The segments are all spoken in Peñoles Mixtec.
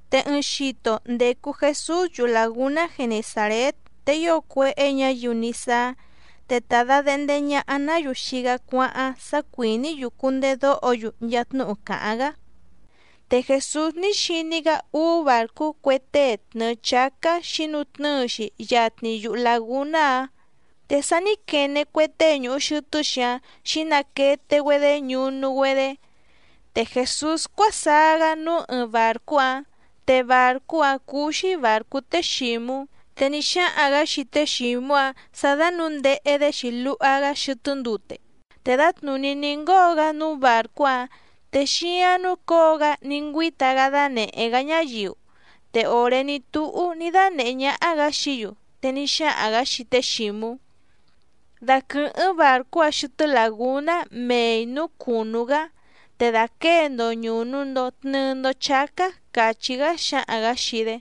Te ɨɨⁿ xito ndècu Jesús yuhu làgúná Genesàrét, te ío cuéhé ñǎyiu ní sáá, te ta dàdehnde ñaha‑ná‑yu xii‑gá cuáháⁿ sá cuìní‑yu cundedóho‑yu nchaa tnúhu càháⁿ‑gá. Te Jèsús ní xiní‑gá úú bàrcú cue tée tnɨ̀ɨ chácá xǐnutnɨ́ɨ‑xi yatni yuhu làgúná‑áⁿ, te sa ní quene cue tée ñùhu xɨtɨ́‑xi‑áⁿ xǐnaquete‑güedé ñunu‑güedé. Te Jèsús cuásaá‑gá núú ɨɨⁿ bàrcú‑áⁿ, te bàrcú‑áⁿ cúú‑xí bàrcú té Xǐmú, te ní xáhaⁿ‑gǎ xii té Xǐmú‑áⁿ sǎ dánǔndehe‑dé‑xi luha‑gá xɨtɨ́ ndute. Te dǎtnùní ní ngóo‑gá núú bàrcú‑áⁿ, te xíáⁿ núcǒo‑gá ní ngüíta‑gá dánèhé‑gá ñáyiu. Te òré ní túhú ní dánèhé ñáhá‑gǎ xií‑yu, te ní xáhaⁿ‑gǎ xii té Xǐmú: —Daquɨ̀hɨ́ⁿ bàrcú‑a xɨtɨ́ làgúná mei nǔú cùnú‑gá, te dàquée‑ndo ñùnu‑ndo tnɨɨ‑ndo chácá —càchí‑gá xǎhaⁿ‑gǎ xii‑dé.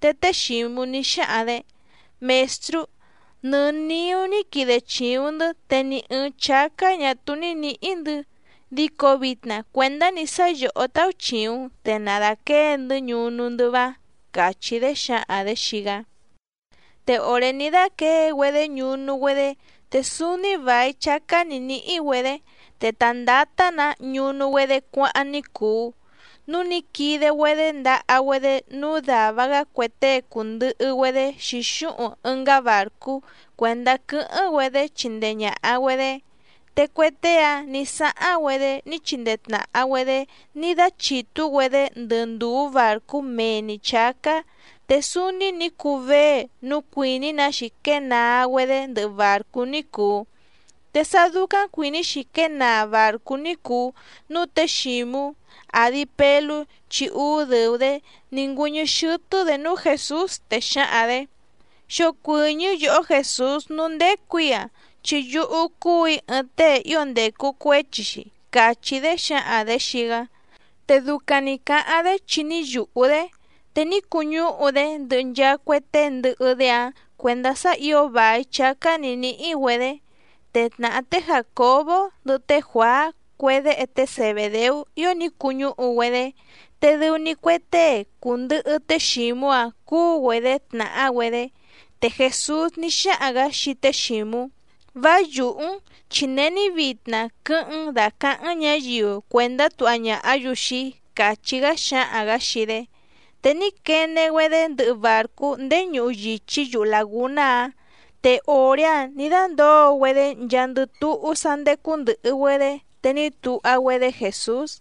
Te té Xǐmú ní xáhaⁿ‑dě: —Mèstrú, nɨ niú ní quide chìuⁿ‑ndɨ́ te ni ɨ̀ɨⁿ chácá ñà túú ní nǐhí‑ndɨ̌, dico vitna cuèndá‑ni sá yòhó táúchìuⁿ‑n te na dàquée‑ndɨ́ ñunu‑ndɨ́ váⁿ —càchí‑dé xǎhaⁿ‑dě xii‑gá. Te òré ní dáquěe‑güedé ñunu‑güedé te súúní vài chácá nǐ níhí‑güedě, te ta ndǎtá‑nǎ ñunu‑güedé cuáháⁿ ní cùu. Núu ní quide‑güedé ndaha‑güedé núú dàva‑gá cue tée cùndɨhɨ‑güedé xǐxúhuⁿ ɨngá bàrcú cuèndá quɨ́hɨ́ⁿ‑güedé chindee ñàha‑güedé. Te cue tée‑áⁿ nǐ sáháⁿ‑güedé ní chindee tnàha‑güedé ní dáchìtú‑güedé ndɨ ndùú bàrcú mee‑ni chǎcá, te súúní nǐ cuu vée núu cuìní‑na‑xi quée naa‑güedé ndɨhɨ bàrcú ní cùu. Te sá dúcáⁿ cuìní‑xi quée naa bàrcú ní cùu, núu té Xǐmú, àdi Pelú chi úú dɨ̀u‑dé, ní ngüɨ́ñɨ́ xɨ́tɨ́‑dě núú Jèsús, te xǎhaⁿ‑dě: —Xocuɨ̀ñɨ́ yòhó Jèsús núú ndécù‑í‑a, chi yúhú cúù‑í ɨɨⁿ tée ío ndècu cuéchi‑xi —càchí‑dé xǎhaⁿ‑dě xii‑gá. Te ducaⁿ nǐ cáháⁿ‑dé chi ní yùhú‑dé, te ní cuñúhu‑dé ndɨhɨ nchaa cue tée ndɨhɨ‑dé‑áⁿ cuèndá sá ǐo vài chácá nǐ níhí‑güedě. Te tnàhá té Jàcobó ndɨhɨ té Juàá cue déhe té Zebèdeú ío ní cuñúhu‑güedé, te dɨu‑ni cue tée cùndɨhɨ té Xǐmú‑áⁿ cúú‑güedě tnàhá‑güedé. Te Jèsús ní xáhaⁿ‑gǎ xii té Xǐmú: —Vá yùhú‑n, chi není vitna quɨ́hɨ́ⁿ‑n dàcaháⁿ‑n ñǎyiu cuèndá tuha ñàhá‑yu xii‑í —càchí‑gá xǎhaⁿ‑gǎ xii‑dé. Te ní quene‑güedé ndɨhɨ bàrcú ndéé ñuhu yìchí yuhu làgúná‑áⁿ. Te òré‑áⁿ nǐ dándǒo‑güedé nchaandɨ túhú sá ndécú ndɨ̀hɨ‑güedé, te ní tuha‑güedé Jèsús.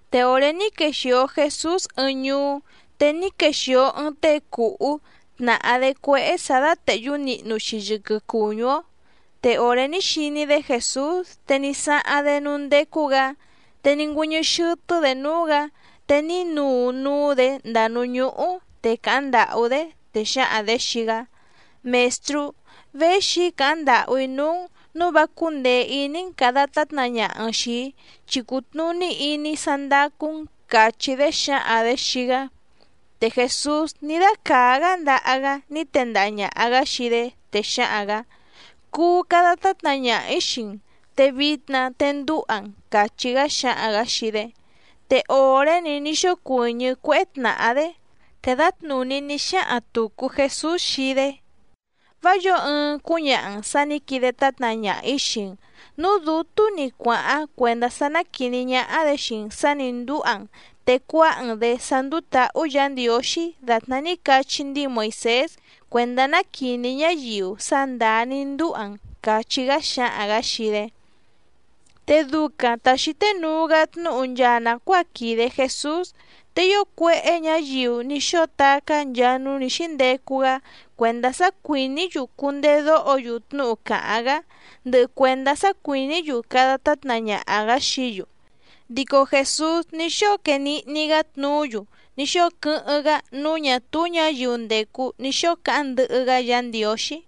Te òré ní quexìo Jesús ɨɨⁿ ñuú, te ní quexìo ɨɨⁿ tée cùhú tnàhá‑dé cuéhé sǎ dátèhyú nihnu‑xi yɨquɨ cùñú‑ó, te òré ní xiní‑dé Jèsús te ní sáháⁿ‑dé núú ndécú‑gǎ, te ní ngüɨ́ñɨ́ xɨ́tɨ́‑dě núú‑gǎ te ní nuu núú‑dě ndàa núú ñúhú te càháⁿ ndàhú‑dé, te xǎhaⁿ‑dě xii‑gá: —Mèstrú, véxi‑í càháⁿ ndàhú‑í núú‑n nǔu vá cúndèe iní‑n càda tátna ñaha‑n xìi‑í, chi cùtnuní iní‑í sá ndácú‑n —càchí‑dé xǎhaⁿ‑dě xii‑gá. Te Jèsús ní dácàá‑gá ndaha‑gá ní tendaha ñàha‑gá xii‑dé, te xǎhaⁿ‑gǎ: —Cuu cada tátna ñaha‑ǐ xii‑n, te vitna te ndúha‑n —càchí‑gá xǎhaⁿ‑gǎ xii‑dé. Te òré‑ni ní xócuɨ̀ñɨ́ cuéhé tnàhá‑dé. Te dǎtnùní ní xáhaⁿ tùcu Jesús xii‑dé: —Vá yǒo ɨɨⁿ cúñaha‑n sǎ nǐ quide tátna ñaha‑ǐ xii‑n, núú dǔtú‑ni cuàháⁿ cuèndá sá ná quìní ñáhá‑dě xii‑n sǎ nǐ ndúha‑n te cuáha‑n‑dě sá ndúú tǎhú Yǎ Ndiǒxí dàtná ní cachí ndíi Moìsés cuèndá ná quìní ñáyiu sá ndàá ní ndúha‑n —càchí‑gá xǎhaⁿ‑gǎ xii‑dé. Te ducaⁿ ta xǐté nuu‑gá tnúhu nchaa nàcuáa quìde Jesús, te ío cuéhé ñǎyiu ní xóo tacá nchaa núú nǐ xíndecu‑gá cuèndá sá cuìní‑yu cundedóho‑yu tnúhu càháⁿ‑gá, ndɨhɨ cuèndá sá cuìní‑yu cada tátna ñaha‑gǎ xií‑yu. Dico Jèsús ní xóo quee nihni‑gá tnuú‑yu ní xóo quɨ́hɨ́ⁿ‑gá núú ñà túú ñǎyiu ndècu ní xóo cáháⁿ ndɨhɨ‑gá Yǎ Ndiǒxí.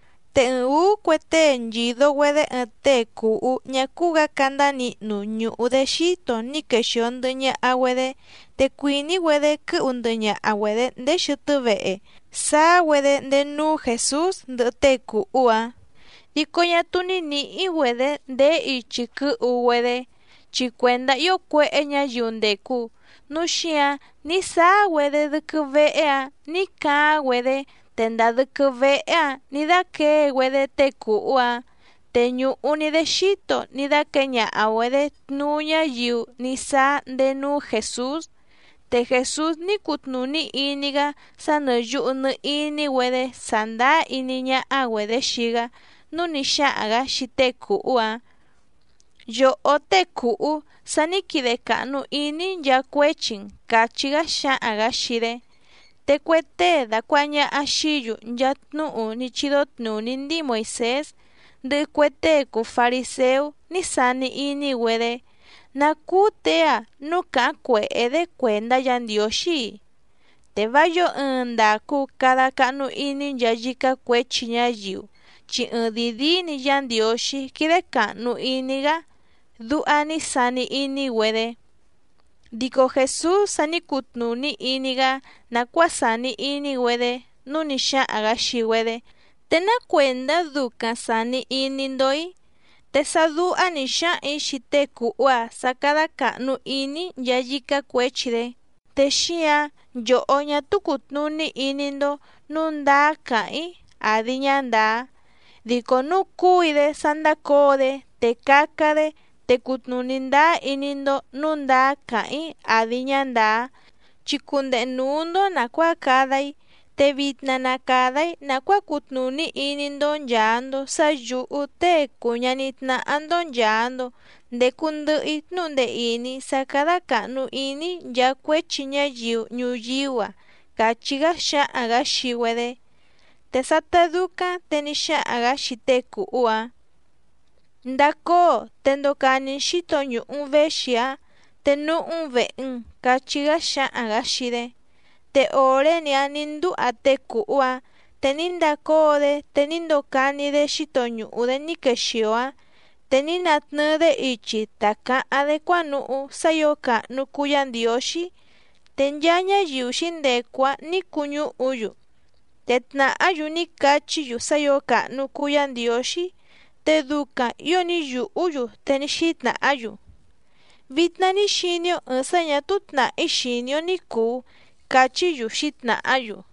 Te ɨɨⁿ ǔú cue tée nchìdo‑güedé ɨɨⁿ tée cùhú ñá cúú‑gǎ candá nihnu ñùhu‑dé xíto ní quexìo ndɨhɨ ñaha‑güedé, te cuìní‑güedé quɨ́hu ndɨhɨ ñaha‑güedě ndéé xɨtɨ́ vehe, sáá‑güedé ndéé núú Jèsús ndɨhɨ tée cùhú‑áⁿ. Dico ñá túú ní nǐhí‑güedě ndèé ichi quɨ́hu‑güedé, chi cuèndá ío cuéhé ñǎyiu ndècu, núu xíǎⁿ ní sáá‑güedé dɨ́quɨ́ véhé‑ǎⁿ nǐ caáⁿ‑güedé te ndàa dɨ́quɨ́ véhé‑ǎⁿ nǐ dáquěe‑güedé tée cùhú‑áⁿ, te ñùhu‑ni‑dé xíto ní dáquěe ñaha‑güedě tnuú ñáyiu ní sáá ndéé núú Jèsús. Te Jèsús ní cutnùní iní‑gá sá nɨ̀ yuhu nɨ iní‑güedé sàndáá iní ñáhá‑güedě xii‑gá, núu ní xáhaⁿ‑gǎ xii tée cùhú‑áⁿ: —Yòhó tée cùhú, sa ní quide càhnu iní‑í nchaa cuéchi‑n —càchí‑gá xǎhaⁿ‑gǎ xii‑dé. Te cue tée dàcuaha ñaha xií‑yu nchaa tnúhu ní chídó tnùní ndíi Moìsés ndɨhɨ cue tée cùu fariséú ní sani iní‑güedé: “¿Ná cúú těe‑a núu càháⁿ cuèhé‑dé cuèndá Yǎ Ndiǒxí‑i? Te vá yǒo ɨɨⁿ ndàcu cada cahnu iní nchaa yícá cuěchi ñáyiu, chi ɨɨⁿdìi díí‑ni Yá Ndiǒxí quídé càhnu iní‑gá”, duha ní sani iní‑güedé. Dico Jèsús sa ní cutnùní iní‑gá nàcuáa sàni iní‑güedé nǔu ní xáhaⁿ‑gǎ xii‑güedé: —¿Te ná cuèndá ducaⁿ sàni iní‑ndó‑í? Te sá dúhá nǐ xáhaⁿ‑ǐ xii tée cùhú‑a sá cádá càhnu iní‑í nchaa yícá cuěchi‑dé, te xíǎⁿ nchòhó ñá túú cùtnuní iní‑ndó nǔu ndáá càháⁿ‑í àdi ñá ndàá. Dico núu cúu‑í‑dé sá ndácǒo‑dé, te caca‑dé te cutnùní ndáá iní‑ndó nǔu ndáá càháⁿ‑í àdi ñá ndàá, chi cundehe nǔú‑ndó nàcuáa cada‑í. Te vitna na càda‑í nàcuáa cutnùní iní‑ndó nchàa‑ndo sá yǔhú Tée cùu ñaní tnáhá‑ndó nchàa‑ndo ndecu ndɨhɨ‑í tnúhu ndee ìní sá cádá càhnu iní‑í nchaa cuéchi ñáyiu ñuyíú‑a —càchí‑gá xǎhaⁿ‑gǎ xii‑güedé. Te sátá dúcáⁿ te ní xáhaⁿ‑gǎ xii tée cùhú‑áⁿ: —Ndacóo, te ndocani‑n xǐto ñùhu‑n véxi‑áⁿ, te núhú‑n vèhe‑n —cachí‑gá xǎhaⁿ‑gǎ xii‑dé. Te òré‑ni‑áⁿ nǐ ndúha tée cùhú‑áⁿ te ní ndacóo‑dé, te ní ndocani‑dé xíto ñùhu‑dé ní quexìo‑áⁿ, te ní natnɨɨ‑dé ichi ta cǎháⁿ‑dé cuánuhú sá ǐo càhnu cuu Yá Ndiǒxí. Te nchaa ñáyiu xǐndecu‑áⁿ nǐ cuñúhu‑yu, te tnàhá‑yu ní cachí‑yu sá ǐo càhnu cuu Yá Ndiǒxí, te ducaⁿ ǐo ní yùhú‑yu, te ní xítnàhá‑yu: —Vitna ní xiní‑ó ɨ̀ɨⁿ sá ñà túú tnàhí xìní‑ó ní cùu —cachí‑yu xǐtnàhá‑yu.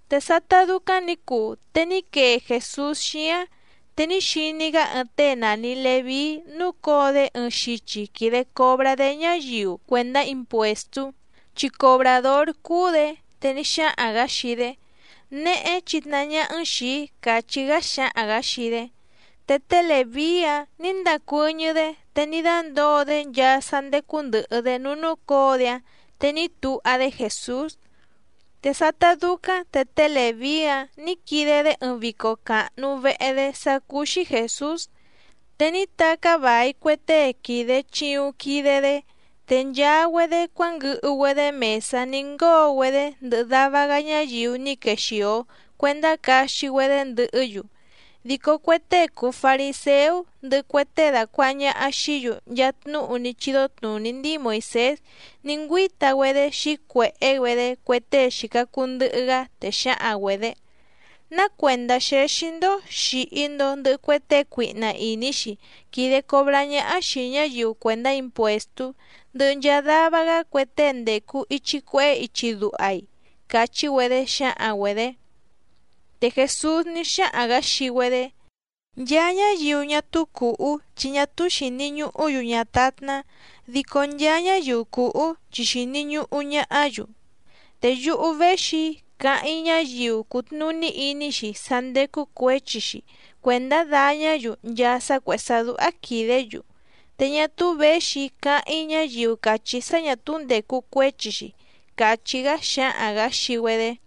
Te sátá dúcáⁿ nǐ cuu te ní quee Jèsús xíáⁿ, te ní xiní‑gá ɨɨⁿ tée nàni Leví núcǒo‑dé ɨɨⁿ xichi quìde cobrá‑dé ñáyiu cuèndá impuèstú, chi cobràdór cúú‑dě, te ní xáhaⁿ‑gǎ xii‑dé: —Néhé chìtnahá ñáhá‑n xìi‑í —càchí‑gá xǎhaⁿ‑gǎ xii‑dé. Te té Lèví‑áⁿ nǐ ndàcuɨ́ñɨ́‑dé te ní dándǒo‑dé nchaa sá ndécú ndɨ̀hɨ‑dé núú núcǒo‑dé‑áⁿ, te ní tuha‑dé Jèsús. Te sátá dúcáⁿ te té Lèví‑áⁿ nǐ quide‑dé ɨɨⁿ vico càhnu vehe‑dé sá cúú‑xí Jèsús, te ní tacá vài cue tée quìde chiuⁿ quide‑dé, te nchaa‑güedé cuánguɨhu‑güedé mèsá ní ngóo‑güedé ndɨhɨ dava‑gá ñáyiu ní quexìo cuendá caxi‑güedé ndɨhɨ́‑yu. Dico cue tée cùu fariséú ndɨhɨ cue tée dàcuaha ñaha xií‑yu nchaa tnúhu ní chídó tnùní ndíi Moìsés ní ngüíta‑güedé xǐcuèhé‑güedé cue tée xìca cuu ndɨhɨ‑gá, te xǎhaⁿ‑güedě: —¿Ná cuèndá xéxí‑ndó xìhi‑ndo ndɨhɨ cue tée cuihna ìní‑xi quìde cobrá ñáhá xìi ñáyiu cuèndá impuèstú, ndɨhɨ nchaa dava‑gá cue tée ndècu ichi cuehé ichi duha‑i? —càchí‑güedé xǎhaⁿ‑güedě. Te Jèsús ní xáhaⁿ‑gǎ xii‑güedé: —Nchaa ñáyiu ñá túú cùhú chi ñá túú xìni ñuhú‑yu ñátátná, dico nchaa ñáyiu cùhú chi xìni ñuhu ñahá‑yu. Te yúhú véxi‑í càháⁿ‑í ñáyiu cùtnuní iní‑xi sá ndécú cuěchi‑xi cuèndá dàñá‑yu nchaa sá cuèhé sá dúhá quìdé‑yu, te ñá túú věxi‑í càháⁿ‑í ñáyiu càchí sá ñà túú ndècu cuéchi‑xi —càchí‑gá xǎhaⁿ‑gǎ xii‑güedé.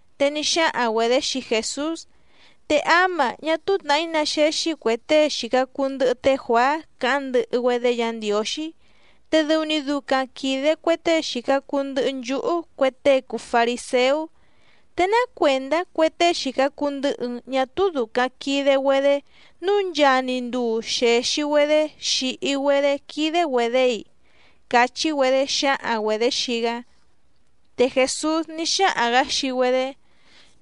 Te ní xáhaⁿ‑güedě xii Jèsús: —Te áma ñá túú tnàhí ná xéxí cuè tée xìca cuu ndɨhɨ té Juàá càháⁿ ndɨhɨ‑güedé Yǎ Ndiǒxí, te dɨu‑ni ducaⁿ quìde cue tée xìca cuu ndɨhɨ nchúhú cue tée cùu fariséú. ¿Te ná cuèndá cue tée xìca cuu ndɨhɨ‑n ñá túú dùcaⁿ quide‑güedé nǔu nchaa‑ni nduu xèxi‑güedé xìhi‑güedé quídé‑güedě‑i? —cachí‑güedé xǎhaⁿ‑güedě xii‑gá. Te Jèsús ní xáhaⁿ‑gǎ xii‑güedé: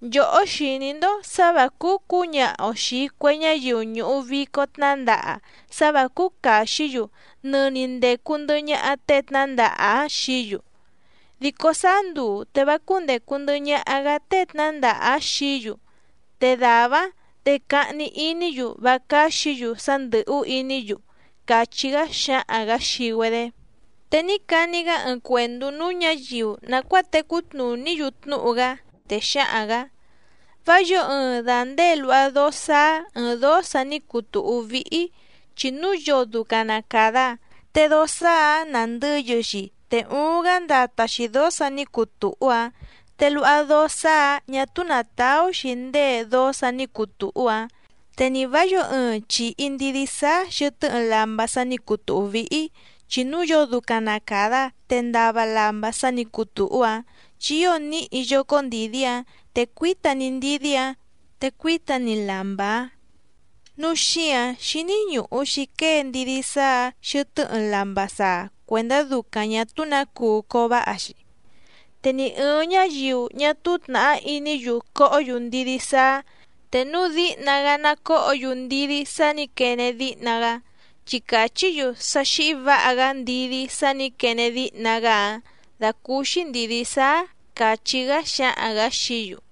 —Nchòhó xìní‑ndó sǎ vǎ cúú cǔñaha‑o xìi cue ñáyiu ñùhu vico tnándaha sá vǎ cúú càxí‑yu nɨni ndècu ndɨhɨ ñaha tée tnǎndaha‑áⁿ xií‑yu. Dico sáá nduu te vá cúndècu ndɨhɨ ñaha‑gá tée tnǎndaha‑áⁿ xií‑yu, te dàvá‑áⁿ te cahni iní‑yu vá cáxǐ‑yu sá ndɨ̀hú iní‑yu —càchí‑gá xǎhaⁿ‑gǎ xii‑güedé. Te ní cani‑gá ɨɨⁿ cuèndú núú ñǎyiu nàcuáa tecú tnùní‑yu tnúhu‑gá, te xǎhaⁿ‑gǎ: —Vá yǒo ɨɨⁿ dàndée luha dóó sáá ɨ̀ɨⁿ dóó sa ní cuu tùhú víhí, chi núu yoo ducaⁿ na càda, te dóó sáá‑ǎⁿ nàndɨyɨ‑xi te uuⁿ‑gá ndata‑xi dǒó sǎ nǐ cuu tùhú‑áⁿ, te luha dóó sáá‑ǎⁿ ñà túú nàtaú‑xi ndée dóó sǎ nǐ cuu tùhú‑áⁿ. Te nì vá yǒo ɨɨⁿ chìhi ndidí sáá xɨ̀tɨ́ ɨɨⁿ lamba sa ní cuu tùhú víhí, chi núu yoo ducaⁿ na càda, te ndava lamba sa ní cuu tùhú‑áⁿ chi ío níhi yócó ndìdí‑áⁿ, te cuíta‑ni ndidí‑áⁿ te cuíta‑ni lamba‑áⁿ. Núu xíǎⁿ xíní ñùhu‑xi quée ndidí sáá‑ǎⁿ xɨtɨ́ ɨɨⁿ lamba saa cuèndá ducaⁿ ñà túú nǎ cuu cováha‑xi. Te ni ɨ̀ɨⁿ ñáyiu ñá túú tnàhá iní‑yu cohó‑yu ndidí sáá, te núu díhna‑gá ná còhó‑yu ndidí sá nǐ quene díhna‑gá, chi càchí‑yu sá xíhí vǎha‑gá ndidí sá nǐ quene díhna‑gá‑áⁿ dàcúúxí ndìdí sáá —càchí‑gá xǎhaⁿ‑gǎ xií‑yu.